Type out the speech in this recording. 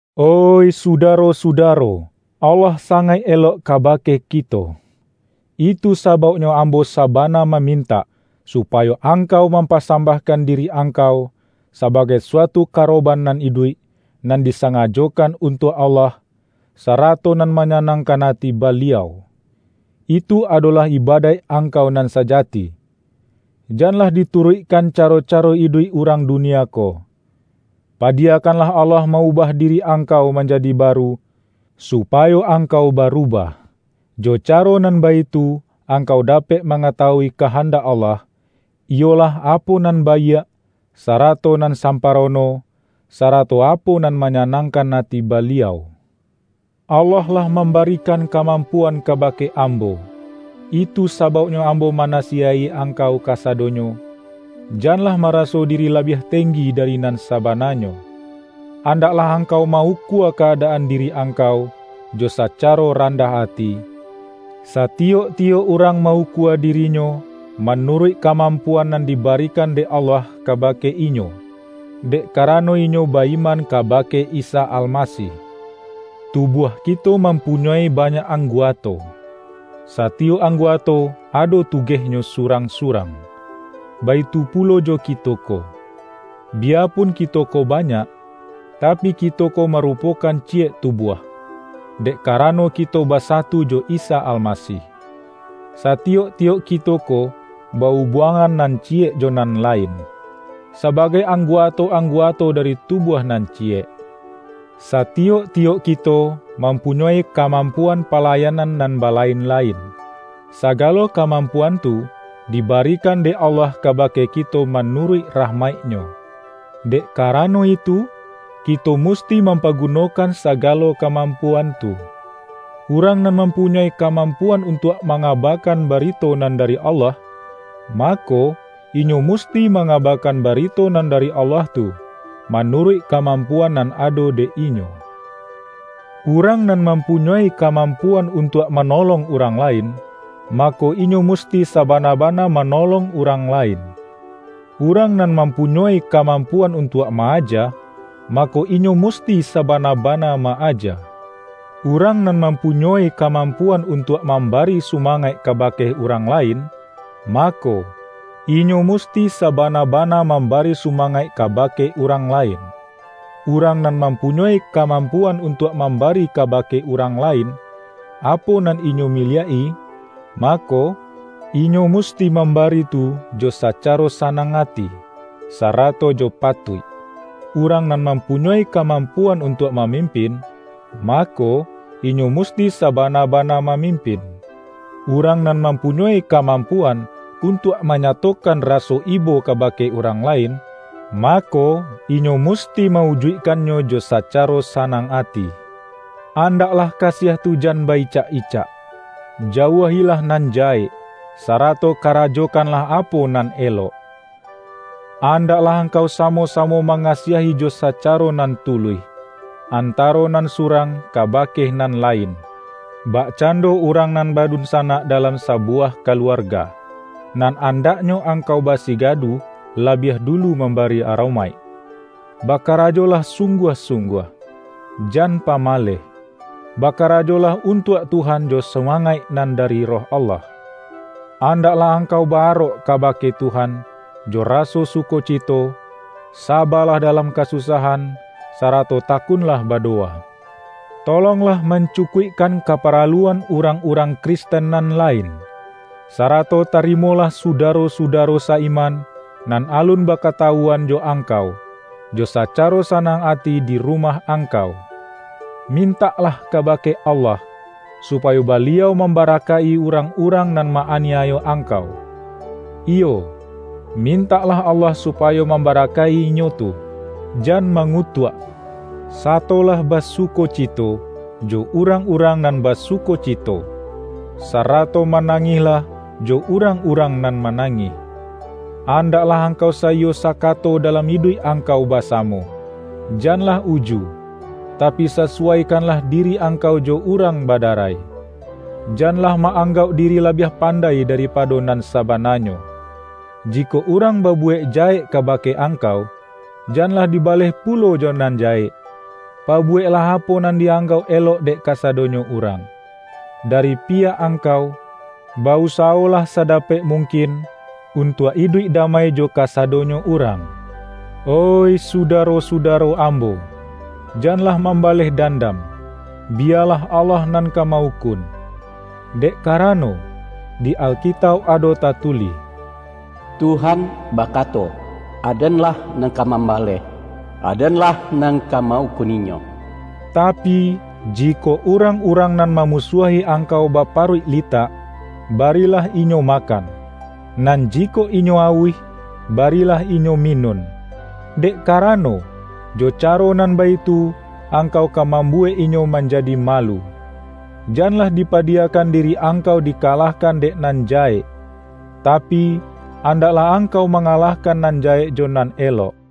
Oih sudaro-sudaro! Allah sangaik elok kabake kito. Itu sabauknyo ambo sabana mamintak, supayo angkau mampasambahkan diri angkau, sabagai suatu karoban nan iduik, nan disangajokan untuak Allah, sarato nan manyanangkan ati Baliau. Itu adolah ibadaik angkau nan sajati. Janlah dituruikkan caro-caro iduik urang dunia ko. Padiyakanlah Allah ma-ubah diri angkau manjadi baru, supayo angkau barubah. Jo caro nan baitu angkau dapek mangatawui kahandak Allah - iyolah apo nan baiak, sarato nan samparono, sarato apo nan manyanangkan ati Baliau. Allah lah mambarikan kamampuan kabake ambo. Itu sabauknyo ambo manasiyaik-i angkau kasadonyo: Janlah maraso diri labiah tenggi dari nan sabananyo. Andaklah angkau ma-ukua ka-adaan diri angkau, jo sacaro randah ati; satiyok-tiyok urang ma-ukua dirinyo, manuruik kamampuan nan dibarikan dek Allah kabake inyo, dek karano inyo ba-iman kabake Isa Almasih. Tubuah kito mampunyoi banyak angguato. Satiyok angguato ado tugehnyo surang-surang. Baitu pulo jo kito ko. Biyapun kito ko banyak, tapi kito ko marupokan ciyek tubuah, dek karano kito basatu jo Isa Almasih. Satiyok-tiyok kito ko ba-ubuangan nan ciyek jo nan lain, sabagai angguato-angguato dari tubuah nan ciyek. Satiyok-tiyok kito, mampunyoi kamampuan palayanan nan balain-lain. Sagalo kamampuan tu, dibarikan dek Allah kabake kito manuruik rahmaik-Nyo. Dek karano itu, kito musti mampagunokan sagalo kamampuan tu. Urang nan mampunyoi kamampuan untuak mangabakan barito nan dari Allah, mako, inyo musti mangabakan barito nan dari Allah tu, manuruik kamampuan nan ado dek inyo. Urang nan mampunyoi kamampuan untuak manolong urang lain, mako, inyo musti sabana-bana manolong urang lain. Urang nan mampunyoi kamampuan untuak ma-aja, mako, inyo musti sabana-bana ma-aja. Urang nan mampunyoi kamampuan untuak mambari sumangaik kabake urang lain, mako, inyo musti sabana-bana mambari sumangaik kabake urang lain. Urang nan mampunyoi kamampuan untuak mambari kabake urang lain, apo nan inyo miliak-i, mako, inyo musti mambari tu jo sacaro sanang ati, sarato jo patuik. Urang nan mampunyoi kamampuan untuak mamimpin, mako, inyo musti sabana-bana mamimpin. Urang nan mampunyoi kamampuan, untuak manyatokan raso ibo kabake urang lain, mako, inyo musti ma-ujuikkannyo jo sacaro sanang ati. Andaklah kasiah tu jan ba-icak-icak. Jauah-ilah nan jahek, sarato karajokanlah apo nan elok. Andaklah angkau samo-samo mangasiahi jo sacaro nan tuluih, antaro nan surang kabake nan lain, bakcando urang nan badunsanak dalam sabuwah kaluarga, nan andaknyo angkau basigadu labiah dulu mambari aromaik. Bakarajolah sungguah-sungguah. Jan pamaleh. Bakarajolah untuak Tuhan jo sumangaik nan dari Roh Allah. Andaklah angkau ba-arok kabake Tuhan, jo raso sukocito, saba-lah dalam kasusahan, sarato takunlah badowa. Tolonglah mancukuikkan kaparaluan urang-urang Kristen nan lain, sarato tarimolah sudaro-sudaro sa-iman, nan alun bakatawuan jo angkau, jo sacaro sanang ati di rumah angkau. Mintaklah kabake Allah, supayo Baliau mambarakaik-i urang-urang nan ma-aniayo angkau. Iyo, mintaklah Allah supayo mambarakaik-i inyo tu, jan mangutuak. Satolah basukocito, jo urang-urang nan basukocito, sarato manangihlah jo urang-urang nan manangih. Andaklah angkau saiyo sakato dalam iduik angkau basamo. Janlah uju, tapi sasuwaikanlah diri angkau jo urang badarai. Janlah ma-anggauk diri labiah pandai daripado nan sabananyo. Jikok urang babuwek jahek kabake angkau, janlah dibaleh pulo jo nan jahek. Pabuweklah apo nan di-anggauk elok dek kasadonyo urang. Dari piyak angkau, ba-usawolah sadapek mungkin untuak iduik damai jo kasadonyo urang. Oih sudaro-sudaro ambo! Janlah mambaleh dandam, biyalah Allah nan ka ma-ukun. Dek karano, di Alkitauk ado tatulih,”Tuhan bakato, Aden-lah nan ka mambaleh. Aden-lah nan ka ma-ukun inyo.” Tapi, jikok urang-urang nan mamusuahi angkau baparuik litak, barilah inyo makan; nan jikok inyo auih, barilah inyo minun. Dek karano, jo caro nan baitu, angkau ka mambuwek inyo manjadi malu. Janlah dipadiyakan diri angkau dikalahkan dek nan jahek, tapi, andaklah angkau mangalahkan nan jahek jo nan elok. ROM A